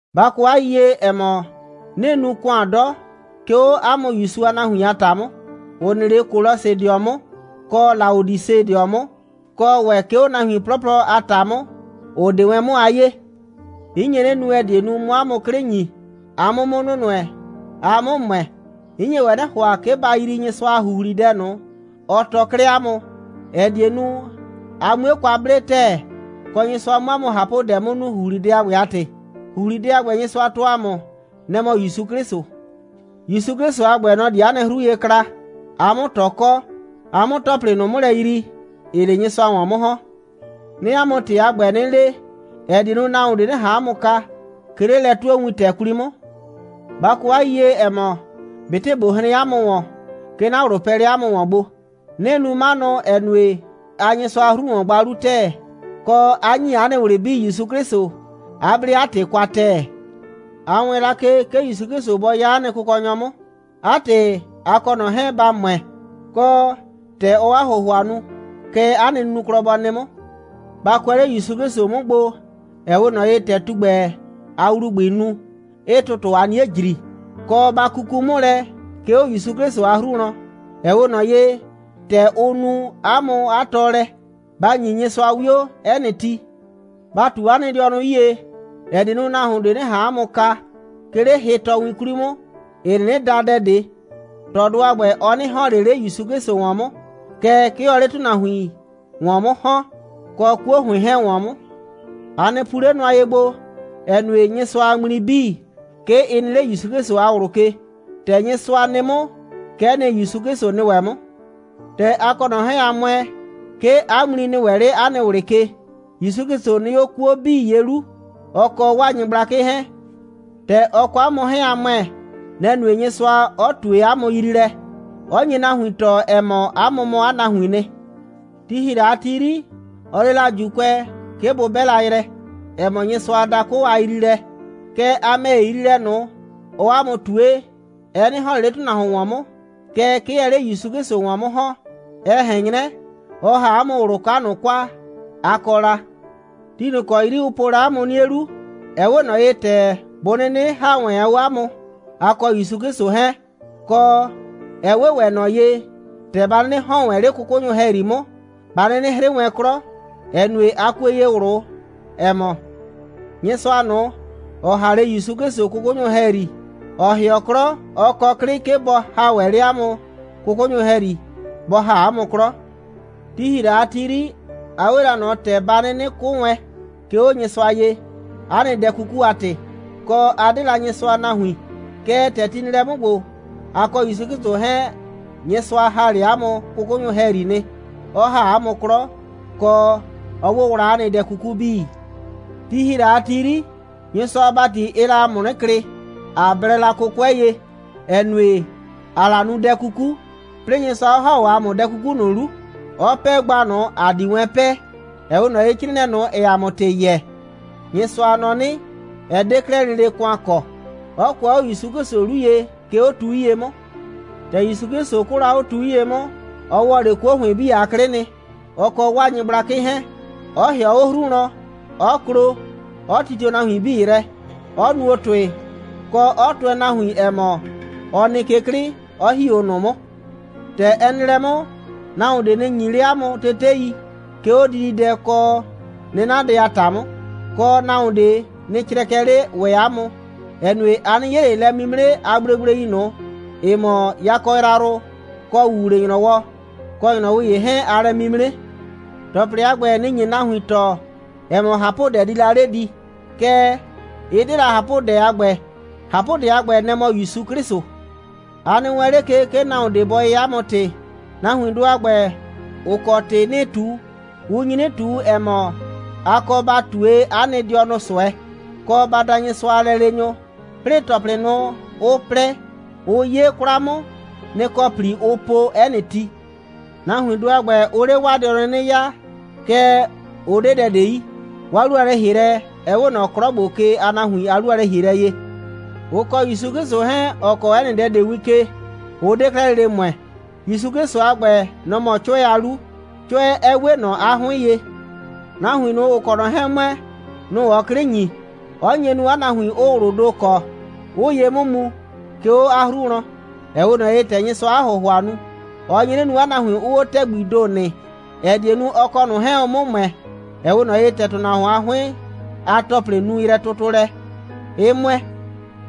Ba kɔ 'a yiyie, ‑ɛ mɔ, 'nɩɩ nu ‑kʋan 'dɔ, 'ke 'o 'a mʋ ‑Yusu a nahuin a ‑ta 'mʋ, ‑ʋ nɩ 'le Kolɔsɩdɩɔ 'mʋ, kɔ Laodisedɩɔ 'mʋ, kɔ ‑wɛ, 'ke 'o nahuin 'plɔplɔ a ‑ta 'mʋ, ‑ʋ 'de wɛn 'mʋ a 'yee. 'N nye 'nɩ nu, ‑ɛ die nu, 'mʋ 'a mʋ 'klɩ ‑nyi, a 'mʋ 'mʋ nʋnʋɛ, a 'mʋ ‑mʋɛ. 'N nye ‑wɛ 'nɩ ‑hʋa, 'ke ba yrii Nyɩsʋa a ‑huhlidɛ ꞊nʋ, ɔ tɔɔ 'klɛɛ 'a mʋ, ‑ɛ die nu, a 'mue kwa 'ble ‑tɛɛ, kɔ, Nyɩsʋa 'mʋ 'a mʋ ꞊hapʋdɛ 'mʋ nu, ‑huhlidɛ a ‑gbɛ a ‑tɩ. ‑Huhlidɛ a ‑gbɛ, Nyɩsʋa tɔɔ ‑a mʋ, nɛ‑ mɔ ‑Yusu 'Klɩsʋ. ‑Yusu 'Klɩsʋ a ‑gbɛ, nɔ‑ di ‑a nɩ 'hru ye kla, ‑a 'mʋ ꞊tɔ kɔ, ‑a 'mʋ ‑tɔplɩ ꞊nʋ 'mʋ lɛ yrii, ‑ɩɩ 'le Nyɩsʋa ‑wɔn 'mʋ ‑hɔn. 'Nɩɩ 'a mʋ ‑tɩ a ‑gbɛ 'nɩ le, ‑ɛ die nu, nahuon ꞊de 'nɩ ꞊han 'a mʋ kaa, 'ke 'le lɛ'tuowintɛ 'kwli 'mʋ. Ba kɔ 'a yiyie, ‑ɛ mɔ, ꞊betɩ ꞊bo hren 'a mʋ ‑wɔn, 'ke 'na ꞊wlʋ pɛɛ 'le 'a mʋ ‑wɔn gbo. 'Nɩɩ nu 'manʋ, ‑ɛ nue, aa Nyɩsʋa a 'hru ‑wɔn gba 'lu ‑tɛɛ, kɔ, 'a ‑nyi 'a nɩ ꞊wlɩ 'bii ‑Yusu 'Klɩsʋ, 'a 'ble 'a ‑tɩ kwa ‑tɛɛ. A wɛɛn la ke, 'ke ‑Yusu 'Klɩsʋ bɔ 'ya 'a nɩ Kʋkɔnyɔ 'mʋ. 'A ‑tɩ, a kɔ ꞊nɔ 'hɛɛn, ba ‑mʋɛ, kɔ, ‑tɛ ɔɔ 'a ‑hʋhʋa nu, kɛ 'a nɩ nunuklɔ bɔ nɩ 'mʋ. Ba kʋɛ 'le ‑Yusu 'Klɩsʋ 'mʋ gbo, ‑ɛ 'we ꞊nɔ ye, ‑tɛ tugbɛ a ‑wlubʋɩɩ nu, 'ɩɩ ‑tʋtʋ a 'nie ‑jri, kɔ, ba kuku 'mʋ lɛ, 'ke 'o ‑Yusu 'Klɩsʋ a 'hru wlɔn, ‑ɛ 'we ꞊nɔ ye, ‑tɛ ʋ nu 'a mʋ 'a tɔɔlɛ. Ba ‑nyi Nyɩsʋa 'wio 'ɛ nɩ ti. Ba ꞊tu 'a nɩ dɩɔnʋ 'yie, ‑ɛ die nu, nahuon ꞊de 'nɩ ꞊han 'a mʋ kaa, 'ke 'le hɩ꞊tɔwin ꞊nʋ 'kwli 'mʋ, ‑ɩ 'nɩnɩ da dɛ ꞊de. ꞊Tɔdʋ a ‑gbɛ, ɔ 'nɩ ‑hɔn ꞊le 'le ‑Yusu 'Klɩsʋ ‑wɔn 'mʋ, kɛɛ, 'ke ɔɔ 'le ‑tʋnahuin ‑wɔn 'mʋ ‑hɔn, kɔ 'kuo ‑hʋɩn 'hɛɛn ‑wɔn 'mʋ. A nɩ pu 'le nʋa ye gbo, ‑ɛ nue, Nyɩsʋa a ŋmli 'bii, 'ke ɩ nɩ 'le ‑Yusu 'Klɩsʋ a ꞊wlʋ ke. ‑Tɛ Nyɩsʋa nɩ 'mʋ, kɛ'ɛ nɩ, ‑Yusu 'Klɩsʋ nɩ ‑wɛ 'mʋ. ‑Tɛ a kɔ ꞊nɔ 'hɛɛn, a ‑mʋɛ, 'ke 'a ŋmli nɩ ‑wɛ 'le 'a nɩ ꞊wlɩ ke. ‑Yusu 'Klɩsʋ nɩ 'o 'kuo 'bii ye 'lu, ɔ kɔ 'waa nyɩgblakɩ 'hɛɛn. ‑Tɛ ɔ kɔ 'a mʋ 'hɛɛn, a ‑mʋɛ, nɛ‑ nue, Nyɩsʋa 'ɔ ꞊tue 'a mʋ yriilɛ, ‑ɛ nye nahuin tɔɔ, ‑ɛ mɔ, 'a mʋ mɔ 'a nahuiin nɩ. Ti ‑hi la a ti 'yri, ɔ le la ‑Juukʋɛ, 'ke bʋ 'bɛ la yrɛ, ‑ɛ mɔ Nyɩsʋa a dakʋ a yriilɛ. Kɛɛ, a ‑mɛ ‑ye, yriilɛ ꞊nʋ, ɔɔ 'a mʋ ꞊tue, ɛ 'nɩ ‑hɔn ꞊le 'le ‑tʋnahuon ‑wɔn 'mʋ, kɛɛ, 'ke ɛɛ 'le ‑Yusu 'Klɩsʋ ‑wɔn 'mʋ ‑hɔn. Ɛ ꞊hɛn 'nyrɛ, ɔ ‑ha 'a mʋ ꞊wlʋ 'ka ꞊nʋ kwa, a kɔ la. Ti ꞊nʋ ‑kɔ 'yri ʋ po la 'a mʋ 'nie 'lu, ɛ 'we ꞊nɔ ‑tɛ bʋ 'nɩnɩ ‑ha wɛn 'o 'a mʋ, a kɔ ‑Yusu 'Klɩsʋ 'hɛɛn, kɔ, ɛ 'we ‑wɛ ꞊nɔ ye, ‑tɛ ba 'nɩnɩ ‑hɔn wɛn 'le 'kʋkʋnyʋ ‑hɛyri 'mʋ, ba 'nɩnɩ 'hrɩ wɛn 'klɔ, ‑ɛ nue, a kue ye ꞊wlʋ, ‑ɛ mɔ, Nyɩsʋa ꞊nʋ, ‑ɔ ‑ha 'le ‑Yusu 'Klɩsʋ 'kʋkʋnyʋ ‑hɛyri, ‑ɔ ‑hɩɔ 'klɔ, ɔ kɔ 'klɩ, 'ke bɔ ‑ha ‑wɛ 'le 'a mʋ 'kʋkʋnyʋ ‑hɛyri, bɔ ‑ha 'a mʋ 'klɔ. Ti ‑hi la a ti 'yri, a 'we la ꞊nɔ ‑tɛ ba 'nɩnɩ 'kʋ wɛn, 'ke 'o Nyɩsʋa ye, 'a nɩ dɛ 'kuku a ‑tɩ, kɔ, a 'de la Nyɩsʋa a nahuin. Kɛɛ, ‑tɛ ti nɩ lɛ 'mʋ ‑gbo, a kɔ ‑Yusu 'Klɩsʋ 'hɛɛn, Nyɩsʋa ‑ha 'le 'a mʋ 'kʋkʋnyʋ ‑hɛyri nɩ, 'ɔ ‑ha 'a mʋ 'klɔ, kɔ, 'ɔ 'wʋwla 'a nɩ dɛ 'kuku 'bii. Ti ‑hi la a ti 'yri, Nyɩsʋa a ‑bati, ɩɩ la ‑a mʋ 'nɩ klɩ, ꞊a blɛ la 'kʋkʋɛ ye, ‑ɛ nue, ‑aa la nu dɛ 'kuku, 'plɩɩ Nyɩsʋa 'ɔ ‑ha 'o ‑a mʋ dɛ 'kuku ꞊nʋ 'lu, 'ɔ 'pɛɛ gba ꞊nʋ, ‑a di wɛn 'pɛɛ. Ɛ 'we ꞊nɔ ye, 'crɩɩnɩɛ ꞊nʋ, ‑ɛɛ ‑a mʋ ‑tɩ yɛɛ, Nyɩsʋa nɔ 'nɩ, ɛ 'de 'klɛɛ lele ‑kʋan kɔ, 'ɔ kʋɛ 'o ‑Yusu 'Klɩsʋ 'lu ye, 'ke 'o tu 'yie 'mʋ. ‑Tɛ ‑Yusu 'Klɩsʋ 'kʋʋ la 'o tu 'yie 'mʋ, ɔ ‑wɔ 'le 'kuo ‑hʋɩn 'bii a 'klɩ nɩ, ɔ kɔ 'waa nyɩgblakɩ 'hɛɛn, 'ɔ ‑hɩɔ 'o 'hru wlɔn, 'ɔ klo, 'ɔ titio nahuin 'bii yrɛ, 'ɔ nuo ‑tʋɩ, kɔ, 'ɔ tʋɛ nahuin, ‑ɛ mɔ, ɔ nɩ ke 'klɩ, 'ɔ ‑hi 'o ꞊nʋ 'mʋ. ‑Tɛ ɛ nɩ lɛ 'mʋ, nahuon ꞊de nɩ ‑nyi 'le 'a mʋ tetei, 'ke 'o dididɛ kɔ 'nɩnadɛ a ‑ta 'mʋ. Kɔ, nahuon ꞊de nɩ crɛkɛ 'le ‑wɛ 'a mʋ, ‑ɛ nue, a 'nɩ 'ye ꞊le lɛ'mimre a gblegblei ꞊nʋ, ‑ɩ mɔ yakɔ yrayrʋ kɔ ‑wuwle‑nyrɔwɔ, kɔ ‑nyrɔwɩ ‑ye 'hɛɛn a lɛ'mimre. ‑Tɔplɩ a ‑gbɛ, nɩ‑ nye la nahuin tɔɔ, ‑ɛ mɔ, ꞊hapʋdɛ di la 'le di. Kɛɛ, ɩ 'de la ꞊hapʋdɛ a ‑gbɛ. ꞊Hapʋdɛ a ‑gbɛ, nɛ‑ mɔ ‑Yusu 'Klɩsʋ. A nɩ wɛɛn 'le ke, 'ke nahuon ꞊de bɔ yɛɛ 'a mʋ ‑tɩ. Nahuindʋ a ‑gbɛ, ‑ʋ kɔ ‑tɩ 'nɩɩ ꞊tu, ʋ nyi 'nɩ ꞊tu, ‑ɛ mɔ, a kɔ ba ꞊tue 'a nɩ dɩɔnʋ ꞊sʋɛ, kɔ, ba da Nyɩsʋa a lɛleenyʋ, 'plɩɩ, ‑tɔplɩ ꞊nʋ, ʋ plɛ, ʋ 'yee 'kwla 'mʋ, nɩ‑ kɔ ‑pli ʋʋ po 'ɛ nɩ ti. Nahuindʋ a ‑gbɛ, ʋʋ 'le 'waa dɩɔnʋ 'nɩ 'yaa. Kɛɛ, ʋ 'de dɛ ꞊de yi. 'Waa 'lu a lɛ‑hielɛ, ɛ 'we ꞊nɔ 'klɔ ‑gbo ke a nahuin a 'lu a lɛ‑hielɛ ye. Ʋ kɔ ‑Yusu 'Klɩsʋ 'hɛɛn, ‑ɔ kɔɔ 'ɛ nɩ dɛ ꞊de win ke, ʋ 'de 'klɛɛ lele ‑mʋɛ. ‑Yusu 'Klɩsʋ a ‑gbɛ, nɔ‑ mɔ 'Cʋɛ a 'lu, 'Cʋɛ 'ɛ 'we ꞊nɔ 'a 'hʋɩn ye. Nahuin ꞊nʋ, ‑ʋ kɔ ꞊nɔ 'hɛɛn ‑mʋɛ, nʋ‑ ɔɔ 'klɩ ‑nyi, 'ɔ nye nu, 'a nahuin 'ʋʋ ꞊wlʋʋ ‑do kɔ, 'ʋʋ ye 'mʋ mu, 'ke 'o 'a hru wlɔn, ‑ɛ 'we ꞊nɔ ye, ‑tɛ Nyɩsʋaa 'a ‑hʋhʋa nu. Ɔ nye 'nɩ nu, 'a nahuin 'ʋʋ 'o ‑tɛgbii ‑do nɩ, ‑ɛ die nu, ɔ kɔ ꞊nʋ 'hɛɛn, ʋ 'mʋ ‑mʋɛ, ‑ɛ 'we ꞊nɔ ye, ‑tɛ ‑tʋnahuon a 'hʋɩn a ‑tɔplɩ nu yrɛtʋtʋlɛ, 'ɩ ‑mʋɛ.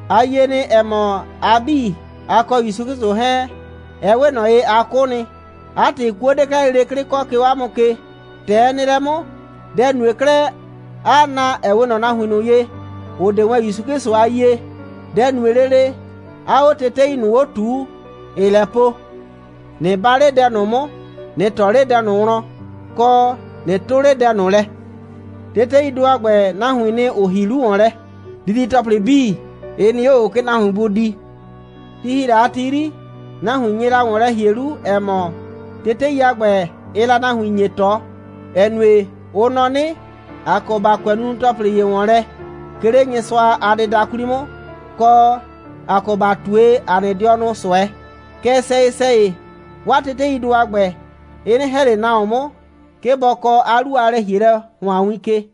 A yie nɩ, ‑ɛ mɔ, a 'bii, a kɔ ‑Yusu 'Klɩsʋ 'hɛɛn, ɛ 'we ꞊nɔ ye, a 'kʋ nɩ. 'A ‑tɩ, 'kuo 'de 'klɛɛ lele 'klɩ kɔ, 'ke 'o 'a mʋ ke. ‑Tɛ ɛ nɩ lɛ 'mʋ, dɛ‑ nue 'klɛɛ, 'aa na, ‑ɛ 'we ꞊nɔ nahuin ꞊nʋ ye, ‑ʋ 'de wɛn ‑Yusu 'Klɩsʋ a yie. Dɛ‑ nue lele, 'aa 'o tetei ꞊nʋ 'o ꞊tuu, ‑ɩɩ lɛ po: «꞊Nɩ 'ba 'le dɛ ꞊nʋ 'mʋ, ꞊nɩ ꞊tɔ 'le dɛ ꞊nʋ wlɔn, kɔ, ꞊nɩ 'tʋ 'le dɛ ꞊nʋ lɛ.» Teteidʋ a ‑gbɛ, nahuiin nɩ, ‑ʋ ‑hi 'lu ‑wɔn lɛ. Didi‑tɔplɩ 'bii, ɩ nɩ 'o ꞊o, 'ke nahuin bʋ di. Ti ‑hi la a ti 'yri, nahuin nye la ‑wɔn lɛ ‑hie 'lu, ‑ɛ mɔ, tetei a ‑gbɛ, ɩɩ la nahuin ‑nyi ꞊tɔ, ‑ɛ nue, ʋ nɔ 'nɩ, ‑a kɔ ‑ba kʋɛ nunu‑tɔplɩ ‑ye ‑wɔn lɛ, 'ke 'le Nyɩsʋa a dɩda 'kwli 'mʋ, kɔ, ‑a kɔ ‑ba ꞊tue ‑a nɩ dɩɔnʋ ꞊sʋɛ. Kɛɛ, sɛyɩ‑sɛyɩ, 'waa teteidʋ a ‑gbɛ, ɩ 'nɩ ‑hɛ ꞊le nahuon 'mʋ, 'ke bɔ kɔɔ 'a 'lu a lɛ‑hielɛ ‑hʋan win ke.